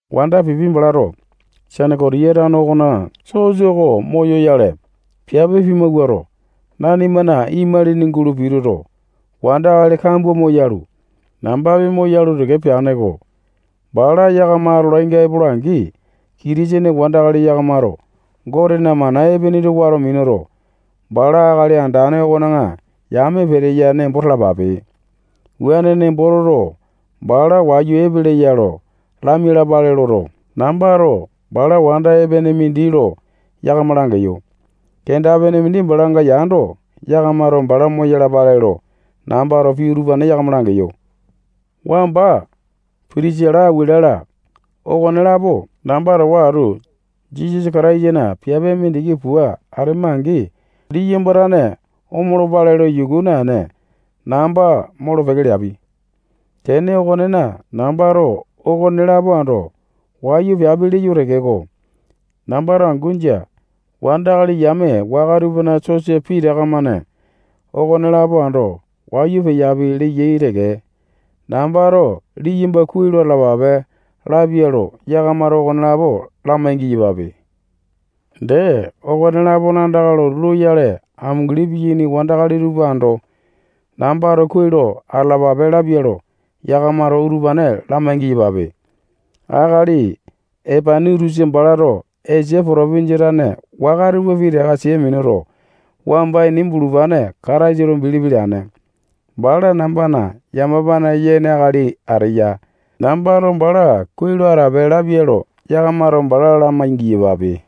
Wanda Pipi balato Senekotiya tano okona sosa oko moyoyale, piape pimawuato, nanimana imalini gulo pituto, wandakali kambua moyalu, nambapi moyalu teke peane-ko. Bala yakama atolainga epola-angi, Kitisene wandakali yakamato Gotena mana epene tupa wato minuto, bala Akali Andane okona yame peteya nembo talapape. Wuane nembo toto, bala wayu epeleya lo lamia-lapale loto, nambato bala wanda epene mindi lo yakama langeyo. Kenda-pene mindi balanga yando, yakamato bala moyalapale lo nambato pii utupane yakama langeyo. Wamba Pitisila, Akuwila-la, okonelapo namba towa atu Jisasa Kataisana piape mindiki pua atema-angi, liyamba tane omolopale lo yuku naene, namba molo-peke leapi. Tene okonena, nambato okonelapo ando wayu peapi leyo tekeko, nambato angu jia. Wandakali yame waka tupana sosa pitaka-mane okonelapo ando wayu peapi leyai teke. Nambato liyamba kuai lo atalapape lapia lo, yakamato okonelapo lamai-giyapape. Dee, okone-lapona andaka lotu loyale amunguli piyaini wandakali tupa ando nambato kuai lo atalapape lapia lo yakamato utupane lamai-giyapape. Akali Epainitusa balato Esia potopinjia tane waka tupa pitaka sia minuto, wamba ini bulupane Kataisa lo bilipi leane. Bala nambana yamapane yene akali ateya. Nambato bala kuai lo atape lapia lo yakamato bala lamai-giyapape.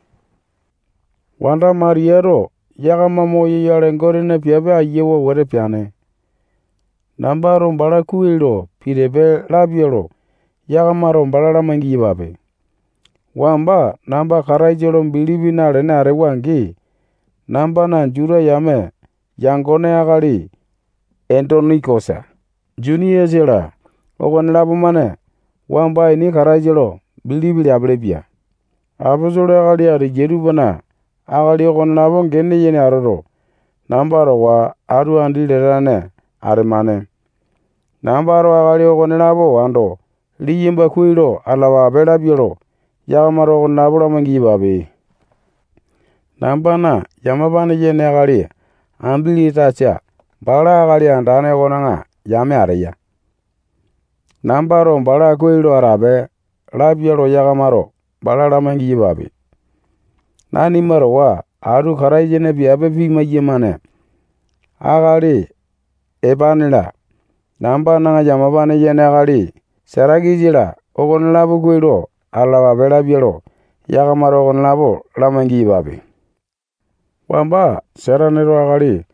Wanda Matiyato yakama moyoyale Gotena piape ayiawa wete peane. Nambato bala kuai lo pitipe lapia lo yakamato bala lamai-giyapape. Wamba namba Kataisa lo bilipi nalene atewa-angi, nambana Juta yame yangone akali Endonikosa, Juniasa-la, okonelapo-mane wamba ini Kataisa lo bilipi leapilipia. Aposolo akali ateyai tupana akali okonelapo gene yene atoto, namba towa atu andi latane atemane. Nambato akali okonelapo ando liyamba kuai lo atalapape lapia lo yakamato okonelapo lamai-giyapape. Nambana yamapane yene akali Ambilatasa bala Akali Andane okona yame ateya. Nambato bala kuai lo atape lapia lo yakamato bala lamai-giyapape. Nanima towa atu Kataisana piape pimai-yamane akali Epane-la, nambana yamapane yene akali Satakisa-la, okonelapo kuai lo atalapape lapia lo yakamato okonelapo lamai-giyapape. Wamba Sataneto akali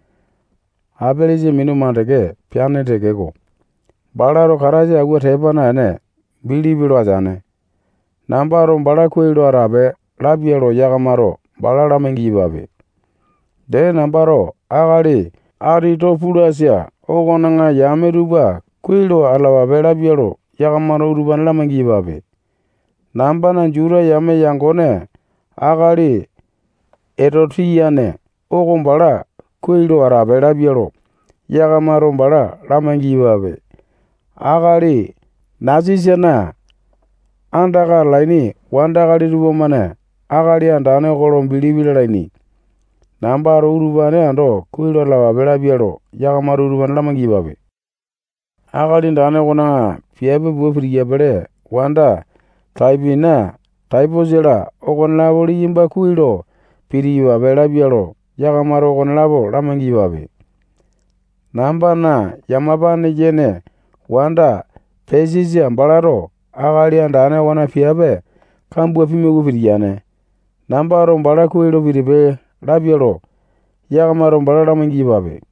Apelesa minu makande peane tekeko, balato Kataisa auwa tepa naene, bilipi lo ateane. Nambato bala kuai lo atape lapia lo yakamato bala lamai-giyapape. Dee, nambato akali Atito-pulasa okona yame tupa kuai lo atalapape lapia lo yakamato utupane lamai-giyapape. Nambana Juta yame yangone akali Etotiane oko bala kuai lo atape lapia lo yakamato bala lamai-giyapape. Akali Nasisana andaka atalaini wandakali tupamane Akali Andane oko lo bilipi lalaini. Nambato utupane ando kuai lo atalapape lapia lo yakamato utupane lamai-giyapape. Akali Andane okona piape pua pitiyapili wanda Taipina, Taiposa-la okonelapo liyamba kuai lo pitiyapape lapia lo yakamato okonelapo lamai-giyapape. Nambana yamapane yene wanda Pesisa balato Akali Andane okona piape kambua pimawua pitiyane. Nambato bala kuai lo pitipe lapia lo yakamato bala lamai-giyapape.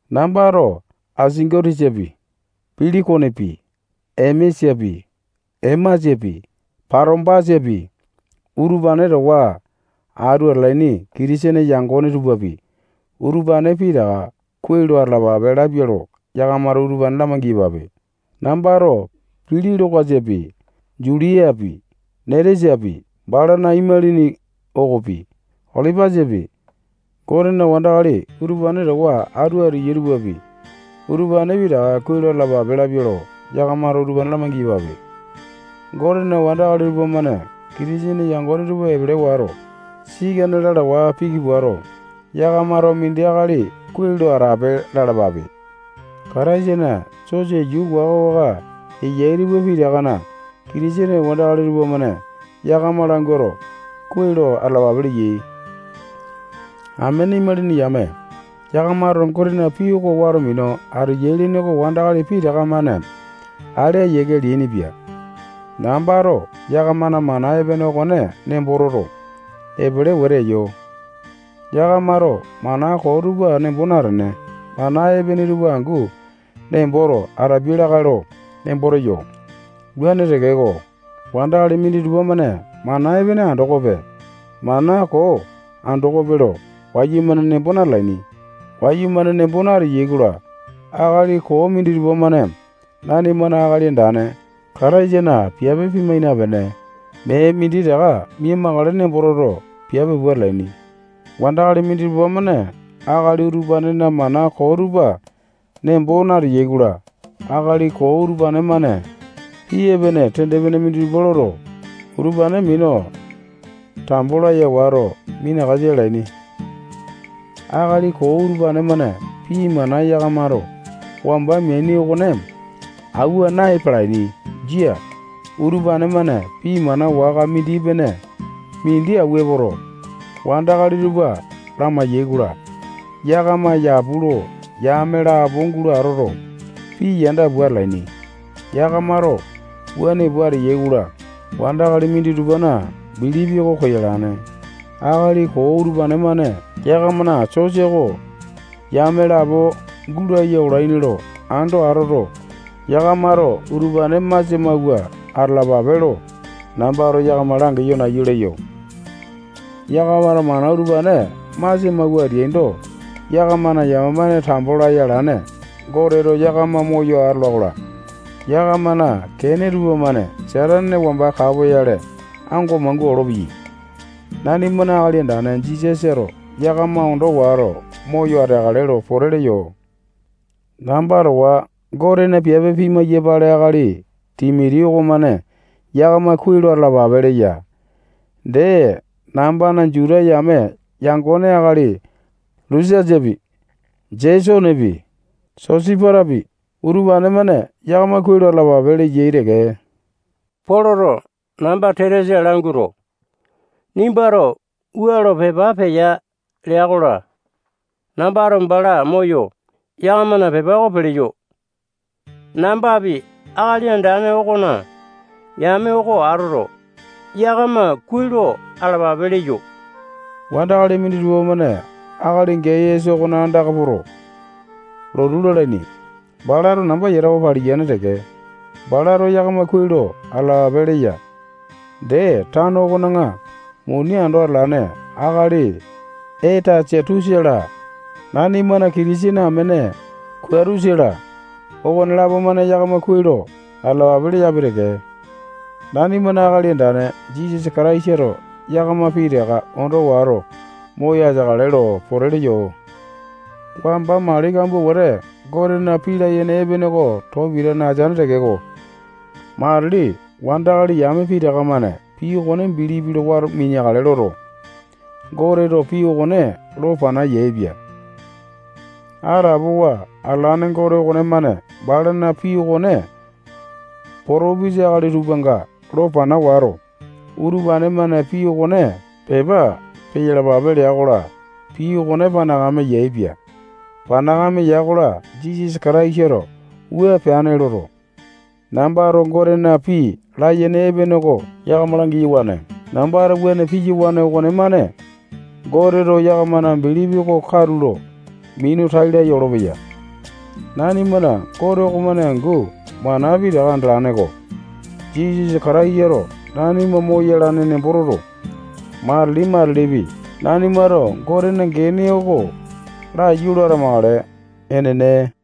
Nambato Asingo-tisapi, Pilikonepi, Emesapi, Emasapi, Patombasapi, utupane towa atu atalaini Kitisene yangone tupapi, utupane pitaka kuai lo atalapape lapia lo yakamato utupane lamai-giyapape. Nambato Pilolo-kasapi, Juliapi, Netiasapi, balana imalini okopi, Olipasapi, Gotena wandakali utupane towa atu ateyai tupapi, utupane pitaka kuai lo atalapape lapia lo, yakamato utupane lamai-giyapape. Gotena wandakali tupamane Kitisene yangone tupa epele wato, sikane lalawa piki puato, yakamato mindi akali kuai lo atape lalapape. Kataisana sosa yuu waka-waka eyai tupa pitakana Kitisene wandakali tupamane yakama languato, kuai lo atalapape leyai. Amene imalini yame, yakamato Gotena pii oko wato minu ateyai lene oko wandakali pitaka-mane ale ayiake leainipia. Nambato yakamana mana epene okone nembo toto, epele wete eyo. Yakamato mana koo tupa nembo natene, mana epene tupa angu nemboto atapiai lakae lo nembo teyo. Wuane tekeko, wandakali minditupa-mane mana epene andokope, mana koo andokope lo wayumane nembo natalaini. Wayumane nembo nateai-kola, akali koo minditupa-mane nanimana Akali Andane Kataisana piape pimai napene, mee minditaka mia-makale nembo toto, piape pua atalaini. Wandakali minditupa-mane akali utupanena mana koo tupa nembo nateyai-kola, akali koo utupane-mane pii epene tende-pene minditupa loto, utupane minu tambo laya wato, minakasa alaini. Akali koo utupane-mane pii mana yakamato wamba meaini okone auwa na-epalaini. Jia. Utupane-mane pii mana waka mindi-pene mindi auwa epoto, wandakali tupa lamai-yaikola, yakama yapu lo yame lapo gulo atoto, pii yanda pua atalaini. Yakamato wuane pua ateyai-kola, wandakali minditupana bilipi oko koyalane. Akali koo utupane-mane yakamana sosa oko yame lapo gulaya olaini lo ando atoto, yakamato utupane masia mauwa atalapape lo nambato yakama langeyo nayu leyo. Yakamato mana utupane masia mawua ateaindo, yakamana yamapane tambo laya alane Goteto yakama moyo atola-kola, yakamana kene tupamane Satane wamba kapoyale ango mangua olopeyai. Nanimana Akali Andane Jisasato yakama ondo wato, moyo ateakale lo pote leyo. Namba towa Gotena piape pimai-yapale akali Timoti okomane yakama kuai lo atalapape leya. Dee, nambana Juta yame yangone akali Lusiasapi, Jesonepi, Sosipatapi, utupane-mane yakama kuai lo atalapape leyai teke. Poloto namba Tetiasa languato, nimbato wua lo pepa peya leya-kola, nambato bala moyo, yakamana pepa oko peleyo. Nambapi Akali Andane okona yame oko atoto, yakama kuai lo atalapape leyo. Wandakali minditupa akali Gayasa okona andaka poto, lotu lalaini. Balato namba yatawa paliyane teke. Balato yakama kuai lo atalapape leya. Dee, tano okona muni ando atalane akali Etasatusa-la, nanimana Kitisene amene Kuatusa-la, okonelapo-mane yakama kuai lo atalapape leyapi teke. [Nanimana Akali Andane Jisasa Kataisato yakama pitaka ondo wato, moyo ateakale lo pote leyo.] Wamba mali kambua wete Gotena pii layene epene oko too pitane ateane tekeko, matili wandakali yame pitaka-mane pii okone bilipi loto, wato mineakale loto, Goteto pii okone lo pana yaepia. Atapowa atalane Gote okonemane balana pii okone potopisa akali tupanga lo pana wato, utupane-mane pii okone pepa peyalapape lea-kola, pii okone panakame yaepia. Panakame ya-kola, Jisasa Kataisato wua peane loto, nambato Gotena pii layene epene oko yakama lamai-yawane. Nambato wuane piyawane okonemane Goteto yakamana bilipi oko katulo minu tai laya olopeya. Nanimana Gote okomane angu mana pitaka andalane-ko. Jisasa Kataisato nanima moyalane nembo toto, matili-matilipi nanimato Gotena gene oko laiyu lo atamakale. Enene.